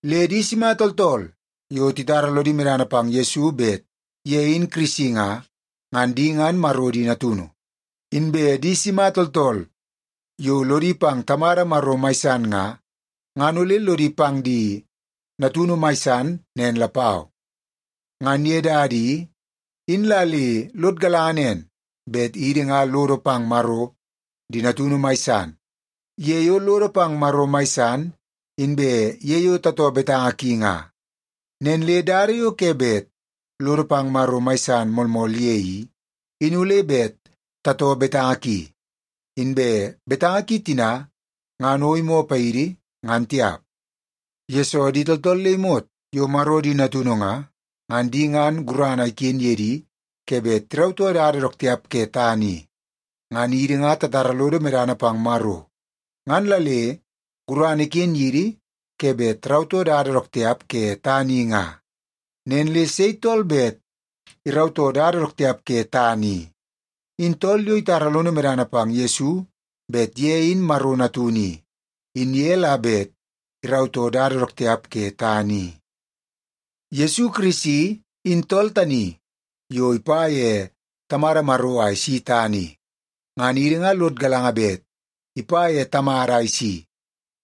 Le di sima tooltool yo titara lodi medana pang Yesu bet ye in Kirisi nga, ngan di ngan Maro di natunu. Inbe di sima tooltool yo lodi pang Tamada Maro mai san nga, ngan ole lodi pang di natunu mai san nen lapau. Ngan ye dada i, in la le lod galanga nen bet idi nga lodo pang Maro di natunu mai san ye yo lodo pang Maro mai san, inbe ye yo tatoo betanga ki nga. Nen le dada yo ke bet lodo pang Maro mai san moolmool ye i, in ole bet tatoo betanga ki. Inbe betanga ki tina ngan o imoo paidi, ngan tiap, yesoo di tooltool le imot yo Maro di natunu nga, ngan di ngan gurana iken ye di ke bet tirautoo dada dook tiap ke tana i. Ngan idi nga tatara lodo medana pang Maro, ngan la le gurana iken yidi ke bet tarautoo dada dook tiap ke tana i nga. Nen le sei tool bet irautoo dada dook tiap ke tana i? In tool yo itara lono medana pang Yesu bet ye in Maro Natunu i, in ye la bet irautoo dada dook tiap ke tana i. Yesu Kirisi in tool tani yo ipa ye Tamada Maro a isi tana i. Ngan idi nga lod galanga bet ipa ye Tamada a isi,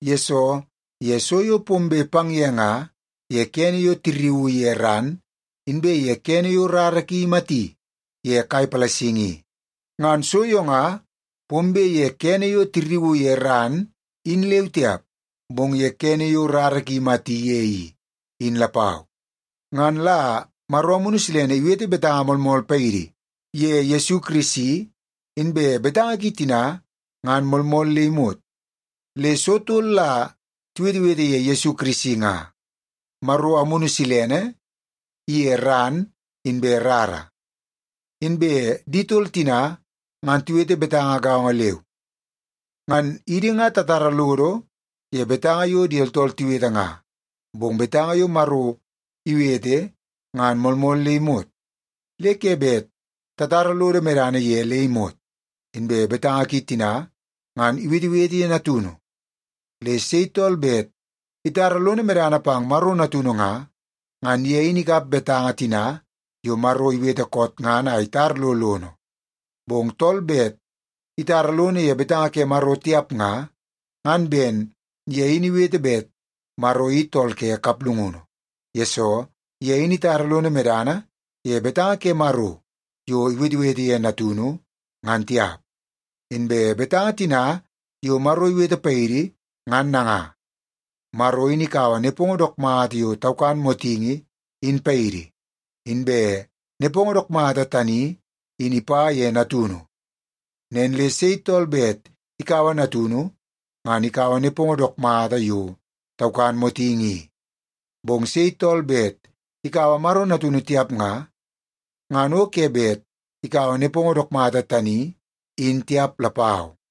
yesoo ye so yo pombe pang ye nga ye kene yo tirriuu ye ran, inbe ye kene yo rara ki imati ye kai palasingi i. Ngan so yo nga pombe ye kene yo tirriuu ye ran in leu tiap, bong ye kene yo rara ki imati ye i, in lapau. Ngan la Maro Amunu Silene iwete betanga moolmool paidi ye Yesu Kirisi, inbe betanga ki tina ngan moolmool le imot. Le so tol la tiwetewete ye Yesu Kirisi nga; Maro Amunu Silene iye ran inbe rara. Inbe di tol tina ngan tiwete betanga gaongo leu. Ngan idi nga tatara lodo ye betanga yo di tooltool tiwete nga, bong betanga yo Maro iwete ngan moolmool le imot, le ke bet tatara lodo medana ye le imot. Inbe betanga ki tina ngan iwetewete ye Natunu. Le sei tool bet itara lono medana pang Maro Natunu nga, ngan ye in ikap betanga tina yo Maro iwete koot ngan a itar lo lono. Bong tool bet itara lono ye betanga ke Maro tiap nga, ngan ben ye in iwete bet Maro i tool ke kaplungunu, yesoo ye in itara lono medana ye betanga ke Maro yo iwetewete ye Natunu, ngan tiap. Inbe betanga tina yo Maro iwete paidi, ngan nanga: Maro in ikaua nepongo dook mata yo taukan motingi in paidi, inbe nepongo dook mata tani in ipa ye Natunu. Nen le sei tool bet ikaua Natunu ngan ikaua nepongo dook mata yo taukan motingi i. Bong sei tool bet ikaua Maro Natunu tiap nga, ngan o ke bet ikaua nepongo dook mata tani in tiap lapau.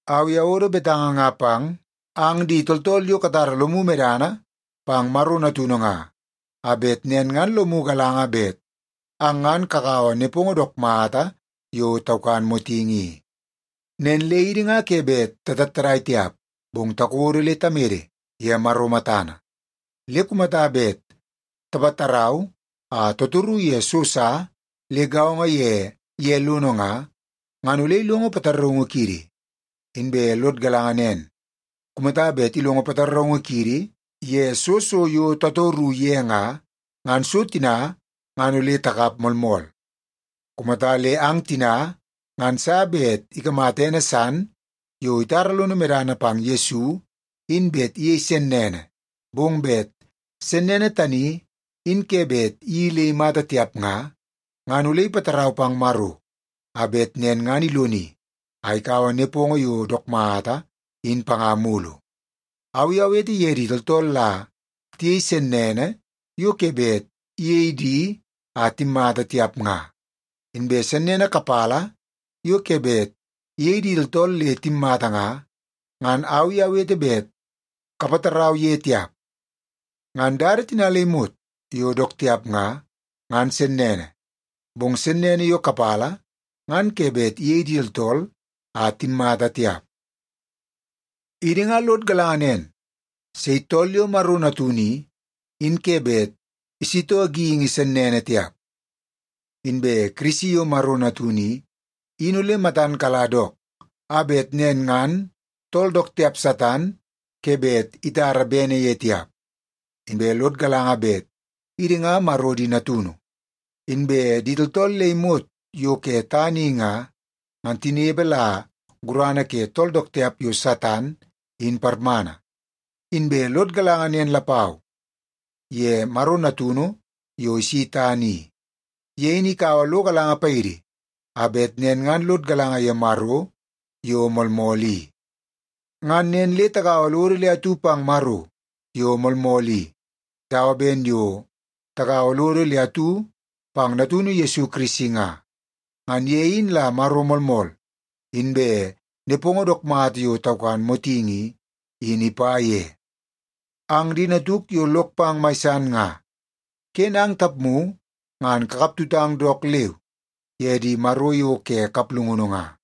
Au i awodo betanga nga pang ang di tooltool yo katara lomu medana pang Maro Natunu nga, a bet nen ngan lomu galanga bet ang ngan kakaua nepongo dook mata yo taukan motingi i. Nen le idi nga ke bet tatattadai tiap, bong takodo le tamede ye Maro matana. Le kumata bet tapatarau a tatoru ye so sa le gaongo ye ye lono nga, ngan ole ilongo pataraungu kiidi. Inbe lod galanga nen, kumata bet ilongo pataraungu kiidi ye soo so yo tatoru ye nga, ngan so tina ngan ole takap moolmool. Kumata le ang tina ngan sa bet ikamata ene san yo itara lono medana pang Yesu in bet iyei sennene, bong bet sennene tani in ke bet iyeii le imata tiap nga, ngan ole ipatarau pang Maro a bet nen ngan iloni a ikaua nepongo yo dook mata in panga mulu. Au i awete ye di tooltool la tiyei sennene yo ke bet iyei di a timmata tiap nga. Inbe sennene kapala yo ke bet iyei di tooltool le timmata nga, ngan au i awete bet kapatarau ye tiap. Ngan dada tina le imot yo dook tiap nga, ngan sennene. Bong sennene yo kapala ngan ke bet iyei di tooltool a timmata tiap. Idi nga lod galanga nen; sei tool yo Maro natunu i, in ke bet isitoo geingi sennene tiap. Inbe Kirisi yo Maro natunu i, in ole matan kala dook, a bet nen ngan tool dook tiap Satan ke bet itara bene ye tiap. Inbe lod galanga bet idi nga Maro di natunu, inbe di tooltool le imot yo ke tana i nga, ngan tinepe la gurana ke tool dook tiap yo Satan, in parmana. Inbe lod galanga nen lapau ye Maro Natunu yo isi tana i. Ye in ikaua lo galanga paidi a bet nen ngan lod galanga ye Maro yo moolmool i. Ngan nen le tagaua lodo le atu pang Maro yo moolmool i, dawa ben yo tagaua lodo le atu pang Natunu Yesu Kirisi nga. Ngan ye in la Maro moolmool, inbe nepongo dook mata yo taukan motingi i, in ipa ye. Ang di natuk yo lok pang mai san nga, ken ang tapmu ngan kakap tutang dook leu ye di maro yo ke kaplungunu nga.